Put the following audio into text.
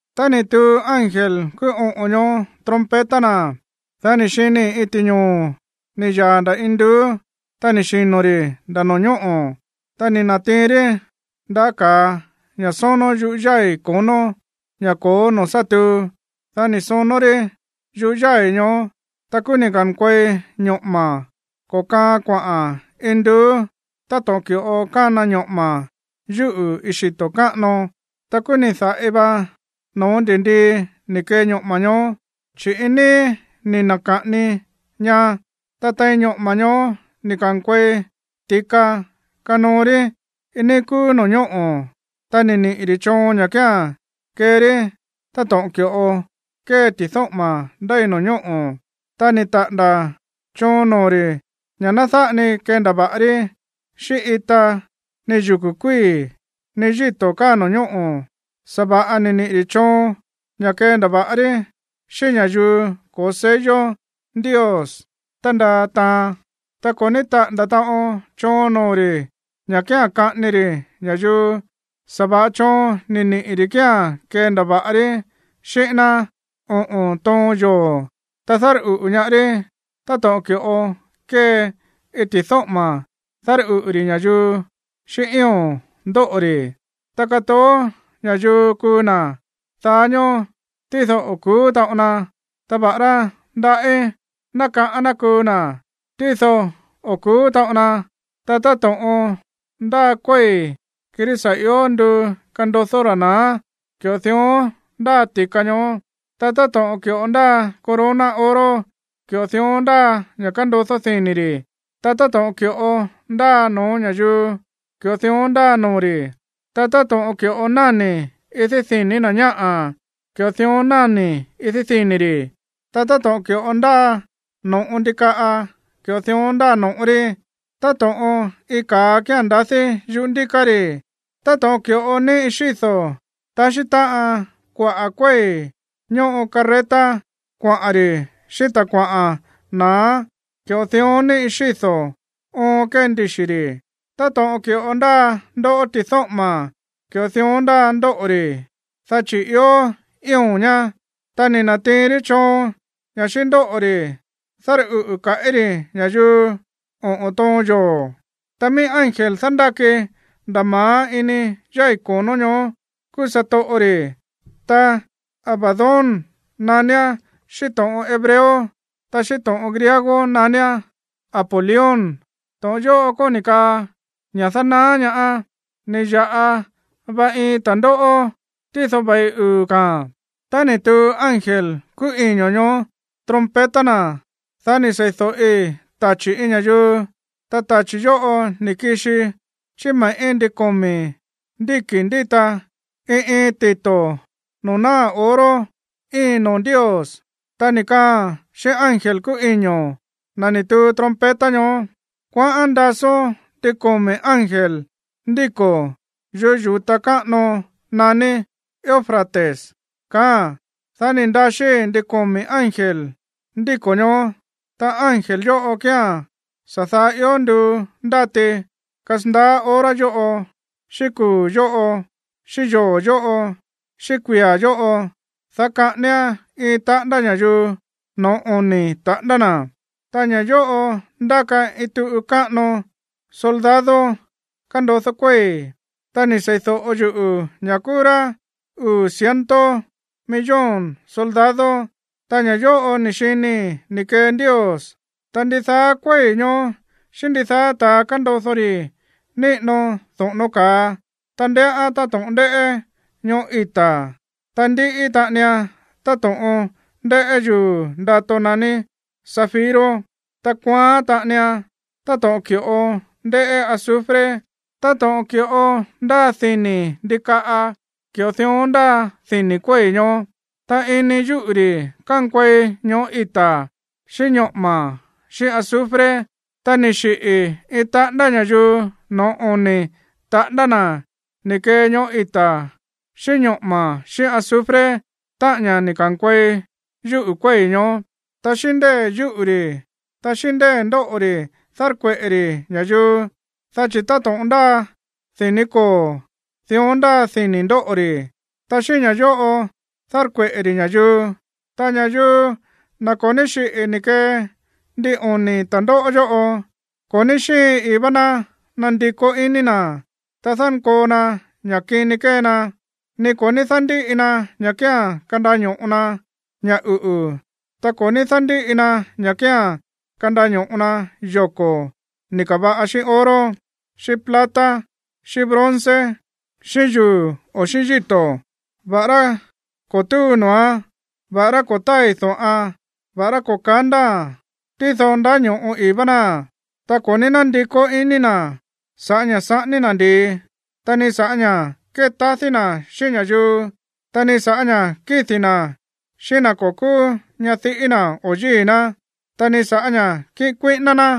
Tá ni̱ tuu ángel kúú oꞌo̱n ñoó trompeta na̱, dá ni̱ xinii̱ iin ti̱ñoo̱ ni̱ yaa̱ nda̱ induú, ta ni̱ xino̱ ri̱ nda̱ no̱ñóꞌo̱, ta ni̱ na̱tiin rí ndaꞌá ka̱a ña̱ sónó yúꞌu̱ yái̱ ko̱nó, ña̱ ko̱ó noo̱ sá tuu. Dá ni̱ sonó rí yúꞌu̱ yái̱ ñoó, ta kúú ni̱ ka̱nkuei ñoꞌo̱ma̱ ko̱kaa kuaꞌa̱n induú táto̱ꞌon ki̱ꞌo kána ñoꞌo̱ma̱ yúꞌu̱ iin xito̱ káꞌano. Ta kúú ni̱ da̱ꞌi va no̱ó ndi̱ndii ni̱ kee ñoꞌo̱ma̱ ñoó, chi̱ iin níí ni̱ na̱ka̱ꞌani ña. Ta tein ñoꞌo̱ma̱ ñoó ni̱ ka̱nkuei ti̱ka kanoo rí iin níí kúú no̱ñóꞌo̱. Ta ni̱ niꞌi̱ ri̱ choon ña̱ kía̱n kee rí táto̱ꞌon ki̱ꞌo kée ti̱dóꞌo̱ma̱ ndéi no̱ñóꞌo̱. Ta ni̱ taꞌa̱nda̱ choon noo̱ ri̱ ña̱ ná dáꞌa ni kendava̱ꞌa rí xíꞌín ita, ni yuku̱ kuíi̱, ni yíto̱ káa no̱ñóꞌo̱. Sa̱va̱ꞌa ni̱ niꞌi̱ ri̱ choon ña̱ kendava̱ꞌa rí xíꞌín ña̱yuu ko̱ó sello Ndios tándaa taan. Ta ko̱ ní taꞌa̱nda̱ taꞌon choon noo̱ ri̱ ña̱ kía̱n kaꞌání ri̱ ña̱yuu. Sa̱va̱ꞌa choon ni̱ niꞌi̱ ri̱ kía̱n kendava̱ꞌa rí xíꞌín ná oꞌo̱n toon yoo̱, ta dárꞌuꞌu̱ ñaá rí táto̱ꞌon ki̱ꞌo kée iin ti̱dóꞌo̱ma̱ dárꞌuꞌu̱ ri̱ ña̱yuu xíꞌín ío̱n ndóꞌo̱ ri̱. Ta katoó ña̱yuu kuu na̱ daá ñóó, tído o̱ ku̱ú taꞌon na. Ta va̱ꞌará ndaꞌí ná kaꞌán ná kuu na̱, tído o̱ ku̱ú taꞌon na. Ta táto̱ꞌon ndáa kuéi̱, kirí sa̱ ió nduu kandodó ra̱ na̱á, ki̱ꞌo dión ndáa ti̱ka ñoó. Ta táto̱ꞌon ki̱ꞌo ndáa corona oro, ki̱ꞌo dión ndáa ña̱ kandodó dini̱ ri̱. Ta táto̱ꞌon ki̱ꞌo ndáa no̱ó ña̱yuu, ki̱ꞌo dión ndáa noo̱ ri̱. Ta táto̱ꞌon ki̱ꞌo náni̱ idí dini̱ na̱ ñáꞌa̱, ki̱ꞌo dión náni̱ idí dini̱ ri̱. Ta táto̱ꞌon ki̱ꞌo ndáa no̱ꞌo ndikaꞌa, ki̱ꞌo dión ndáa no̱ꞌo rí. Táto̱ꞌon iin ka̱a kía̱n ndadí yuꞌú ndíká ri̱. Táto̱ꞌon ki̱ꞌo níꞌi xído̱ taxí táꞌan kuaꞌa̱ kuéi̱ ñoꞌo carreta kuaꞌa̱n ri̱ xíꞌín ta̱ kuaꞌa̱n na̱á, ki̱ꞌo dión níꞌi xído̱ oon kée ndixi̱ ri̱. Táto̱ꞌon ki̱ꞌo ndáa ndóꞌo̱ ti̱dóꞌo̱ma̱, ki̱ꞌo dión ndáa ndóꞌo̱ ri̱, dá chi̱ ió ío̱n ñá. Ta ni̱ na̱tiin rí choon ña̱ xíꞌín ndóꞌo̱ ri̱ dárꞌuꞌu̱ kaꞌí ri̱ ña̱yuu oꞌo̱n toon yoo̱. Ta mií ángel dándáki nda̱ ma̱á ini yái̱ konó ñoó kúú satoꞌo ri̱, ta Abadón naníán xíꞌín to̱ꞌon hebreo, ta xíꞌín to̱ꞌon griego naníán Apolión. To̱ꞌon yóꞌo kóni̱ kaa, ña̱ dánaá ñaá. Ni̱ ya̱ꞌa va iin ta̱ndóꞌó, tído ve̱i uu̱ ka̱a̱n. Tá ni̱ tuu ángel kúú iño̱ ñoó trompeta na̱, dá ni̱ sei̱do̱ꞌi tachi̱ iin ña̱yuu, ta tachi̱ yóꞌo ni̱ kixi chí me̱ꞌí ndin komi̱ ndíki̱ ndíta iin iin tito̱ noo̱ náa̱ oro íin noo̱ Ndios, ta ni̱ kaaa̱n xíꞌín ángel kúú iño̱, na̱ ni̱ tuu trompeta ñoó: ―Kuaꞌán ndasón ndin komi̱ ángel ndíko̱ yuꞌú yu̱ta káꞌano naní Eufrates ―kaáa̱n. Dá ni̱ ndaxí ndin komi̱ ángel ndíko̱ ñoó, ta ángel yóꞌo kía̱n sa̱ daá ió nduu ndáti kasandaá hora yóꞌo, xíꞌín kuu̱ yóꞌo, xíꞌín yoo̱ yóꞌo, xíꞌín kuia̱ yóꞌo, dá kaꞌáníán iin taꞌándá ña̱yuu no̱ó oni̱ taꞌándá na̱. Ta ña̱ yóꞌo ndáka iin tuꞌu káꞌano soldado kándodó kuéi̱. Ta ni̱ sei̱do̱ꞌo yuꞌu̱ ña̱ kúú rá uu̱ ciento millón soldado. Ta ña̱ yóꞌo ni̱ xinii̱ ni̱ kee Ndios, ta ndidaá kuéi̱ ñoó xíꞌín ndidaá ta̱ kándodó ri̱ níꞌino doꞌo̱no̱ ka̱a, ta ndéꞌán táto̱ꞌon ndéꞌé ñoꞌó ita̱. Ta ndíꞌí taꞌanian táto̱ꞌon ndéꞌé yuu̱ ndato naní zafiro. Ta kuaán taꞌanian táto̱ꞌon ki̱ꞌo ndéꞌé azufre. Táto̱ꞌon ki̱ꞌo ndáa dini̱ ndikaꞌa, ki̱ꞌo dión ndáa dini̱ kuéi̱ ñoó. Ta ini yúꞌu̱ ri̱ kánkuei ñoꞌó ita̱, xíꞌín ñoꞌo̱ma̱ xíꞌín azufre. Ta ni̱ xiꞌi̱ iin taꞌándá ña̱yuu no̱ó oni̱ taꞌándá na̱ ni̱ kee ñoꞌó ita̱ xíꞌín ñoꞌo̱ma̱ xíꞌín azufre, táꞌa̱n ña̱ ni̱ ka̱nkuei yúꞌu̱ kuéi̱ ñoó. Ta xíꞌín ndée̱ yúꞌu̱ ri̱, ta xíꞌín ndée̱ ndóꞌo̱ ri̱ dárkueꞌe̱ ri̱ ña̱yuu, dá chi̱ táto̱ꞌon ndáa dini̱ koo̱, dión ndáa dini̱ ndóꞌo̱ ri̱, ta xíꞌín ña̱ yóꞌo dárkueꞌe̱ ri̱ ña̱yuu. Ta ña̱yuu, na̱ ko̱ ní xiꞌi̱ ni̱ kee ndin oni̱ ta̱ndóꞌó yóꞌo, ko̱ ní xíin ii̱ vá ná nandikó iní na̱, ta dánkoo na ña̱ kini kée na, ni ko̱ ní dándíꞌi na ña̱ kía̱n kandaño̱ꞌo na ña̱ uꞌu̱, ta ko̱ ní dándíꞌi na ña̱ kía̱n kandaño̱ꞌo na yoko̱ ni̱ ka̱va̱ꞌa xíꞌín oro, xíꞌín plata, xíꞌín bronze, xíꞌín yuu̱ o xíꞌín yíto̱, va̱ꞌará ko̱ túu noo̱án, va̱ꞌará ko̱ tái̱ do̱ꞌan, va̱ꞌará ko̱ kándaa̱a̱n, tído ndáño̱ꞌo ii̱ vá náa̱n. Ta ko̱ ní nándikó iní na̱ sa̱ꞌá ña̱ saꞌání ná ndi̱i, ta ni sa̱ꞌá ña̱ kétadí na̱ xíꞌín ña̱yuu, ta ni sa̱ꞌá ña̱ kídi̱ na̱ xíꞌín na̱ ko̱ kúú ñadiꞌí na̱ o yíi̱ ná, ta ni sa̱ꞌá ña̱ kíꞌin kuíꞌíná ná.